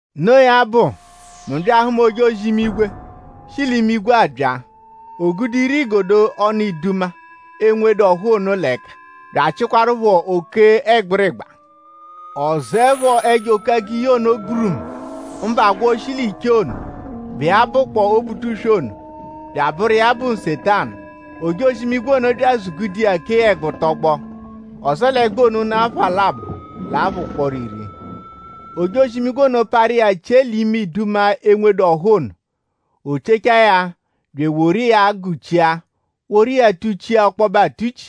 Noo ya bụ; mu bya ahụma ojozi-imigwe, shi l'imigwe abya. O gude ire-igodo ọnu iduma, enwedu ọ́hú ono l'ẹka; bya achịkwarupho oke ẹgbirigba. Ọ zụepho ẹjo-oke-agiyi ono gburumu; mbụ agwọ shi l'ichee ono, bụ iya bụkpoo Obutuswe ono bya abụru iya bụ Nsetanu. Ojozi-imigwe ono bya azụ-gude iya kee ya ẹgbu tọgbo; ọ zẹe l'ẹgbu ono ụnu apha labọ l'apha ụkporo iri. Ojozi-imigwe ono parụ iya chie l'ime iduma, enwedu ọ́hú ono. O chiechaa ya bya eworu iya gụ-chia; woru iya tụ-chia ọkpobe atụ-chi;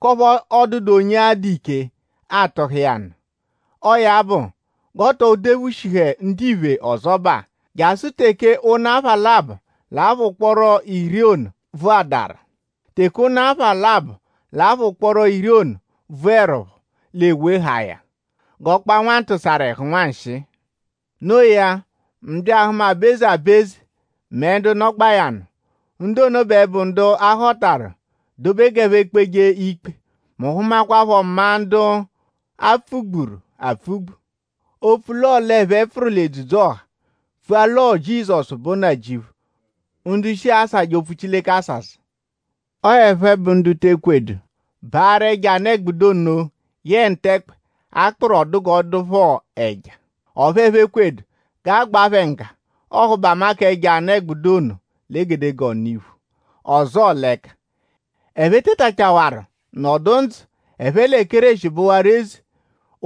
k'ọphu ọ dụdu onye adụ ike atụha iya nụ. Ọo ya bụ g'oo too dephushihẹdu ndiphe ọzobaa jasụ teke ụnu apha labọ l'apha ụkporo iri ono bvụadaru. Teke ụnu apha labọ l'apha ụkporo iri ono bvụerupho l'e wehaa ya g'ọ kpaa nwantụsaru-ẹhu nwanshịi. Noo ya; mu bya ahụma aba-eze aba-eze mẹ ndu nọgbaa ya nụ. Ndu ono bẹ bụ ndu a họtaru dobe g'ẹphe kpeje ikpe. Mu hụmakwapho maa ndu a pfụ-gburu apfụ-gbu; opfu l'ọo l'ẹphe pfụru l'edzudzu-ọha pfua l'ọo Jizọsu bụ Nnajịuphu; ndu shi asajẹ opfu Chileke asasa. Ọo ẹphe bụ ndu te ekwedu baarụ ẹjo anụ-ẹgbudu ono yẹe ntẹkpe, a kpụru ọ dụ g'ọ dụ phọ ẹja; ọphu ẹphe ekwedu g'a gbaa phẹ ngga ọhubama k'ẹjo anụ-ẹgbudu ono l'egedegee ọnu-iphu ọzoo l'ẹka. Ẹphe tetachawaru nọdu ndzụ; ẹphe lẹ Kéreshi bụwaru eze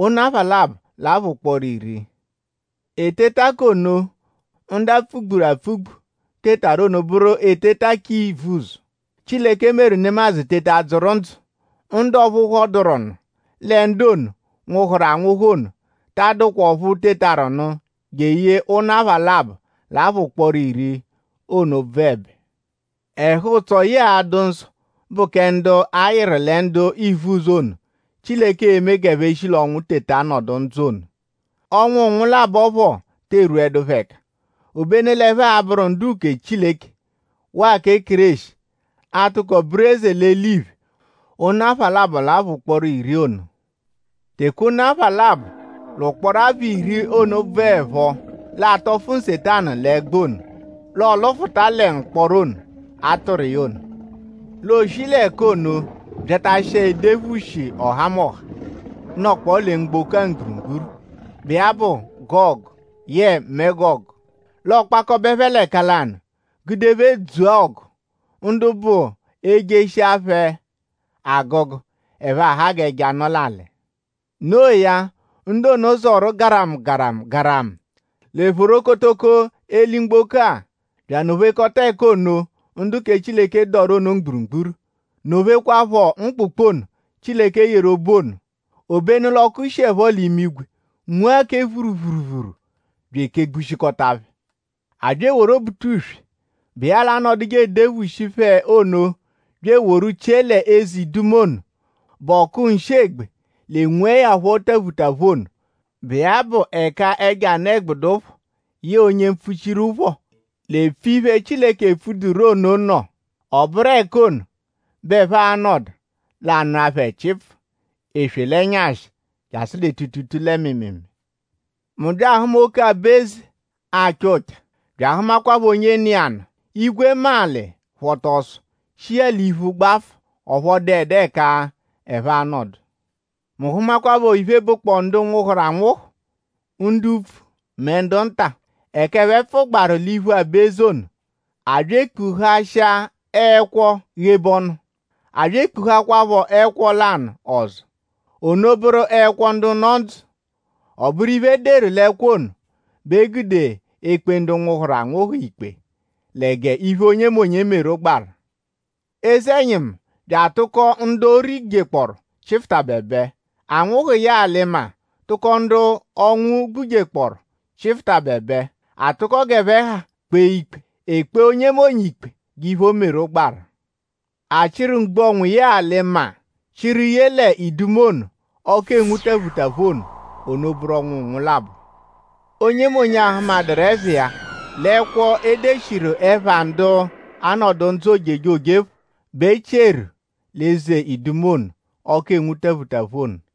ụnu apha labọ l'apha ụkporo iri. Eteta k'ono, ndu a pfụ-gburu apfụ-gbu tetaru ono bụru eteta k'ivuzọ, Chileke meru nemadzụ teta dzụru ndzụ. Ndu ọphu phọduru nụ lẹ ndu ono, nwụhuru anwụhu ono ta adụkwa ọphu tetaru nụ jeye ụnu apha labọ l'apha ụkporo iri ono bvụebe. Ẹhu-ụtso yẹe adụ-nsọ bụ kẹ ndu a-yịru lẹ ndu ivuzọ ono, Chileke e-me g'ẹphe shi l'ọnwu teta nọdu ndzụ ono. Ọnwu nwụ-labọ phọ te erwudu phẹ ẹka; obenu l'ẹphe a-bụru ndu-uke kẹ Chileke; waa kẹ Kéreshi a-tụko bụru eze l'eliphe ụnu apha labọ l'apha ụkporo iri ono. Teke ụnu apha labọ l'ụkporo apha iri ono bvụerupho; l'aa-tọfu Nsetanu l'ẹgbu ono l'ọo-lụfuta lẹ mkpọro ono, a tụru iya ono. L'ooshi l'ẹka ono byatashịkwa edephushi ọhamoha, nọkpoo lẹ mgboko mgburugburu, bụ iya bụ Gọgu yẹe Megọgu. L'ọokpakobe phẹ l'ẹka lanụ gude phẹ dzua ọgu. Ndu bụ e -jeshia phẹ agụgu ẹphe aha g'ẹja, nọ l'alị. No iya; ndu ono zọru garamu garamu garamu lẹ phorokotoko eli-mgboko-a; bya anọ-phekọta ẹka ono, ndu kẹ Chileke dọru ono mgburugburu; nọ-phekwaaphọ mkpụkpu ono, Chileke yeru obu ono. Obenu l'ọku shiẹpho l'imigwe nwua kẹ phuruphuruphuru bya ekegbushikọta phẹ. A bya eworu Obutuswe, bụ iya l'anọduje eduphushi phẹ ono bya eworu chie l'eze iduma ono, bụ ọku nshị-egbe l'enwuẹ ya phọ taphutaphu ono, bụ iya bụ ẹka ẹjo anụ-ẹgbudu phọ yẹe onye mpfuchiru phọ l'epfuje iphe, Chileke epfuduru ono nọ. Ọ bụru ẹka ono bẹ ẹphe a-nọdu l'aa-nụa phẹ chịipfuu eswe l'ẹnyashi jasụ lẹ tuutuutuu lẹ mịimiimii. Mu bya ahụma oke aba-eze acha ụcha; bya ahụmakwapho onye nọ iya nụ. Igwe mẹ alị phọta ọso; shi iya l'iphu gbafụ. Ọphu ọ dụedu ẹka ẹphe a-nọdu. Mu hụmakwapho iphe, bụkpoo ndu nwụhuru anwụhu; ndu upfu mẹ ndu nta; ẹka ẹphe pfụgbaaru l'iphu aba-eze ono. A bya e kpuhashịa ẹkwo ghebe ọnu; a bya ekpuhakwaaphọ ẹkwo lanụ ọzo; ono bụru ẹkwo ndu nọ ndzụ. Ọ bụru iphe, e deru l'ẹkwo ono bẹ e gude ekpe ndu nwụhuru anwụhu ikpe lẹ g'iphe onyemonye meru gbaru. Eze-ẹnyimu bya atụko ndu o rijekpọoru chịfutabebe. Anwụhu yẹe alị-maa tụko ndu ọnwu gbujekpọoru chịfutabebe. A tụko g'ẹphe ha kpee ikpe. E kpee onyemonye ikpe g'iphe, o meru gbaru. A chịru mgbu-ọnwu yẹe alị-maa chịru ye l'eze iduma ono, ọku enwu taphutaphu ono. Ono bụru ọnwu nwụ-labọ. Onyemonye, a hụmaduru ẹpha iya l'ẹkwo, e deshiru ẹpha ndu a-nọdu ndzụ ojejoje phọ bẹ e chieru l'eze iduma ono, ọku enwu taphutaphu ono.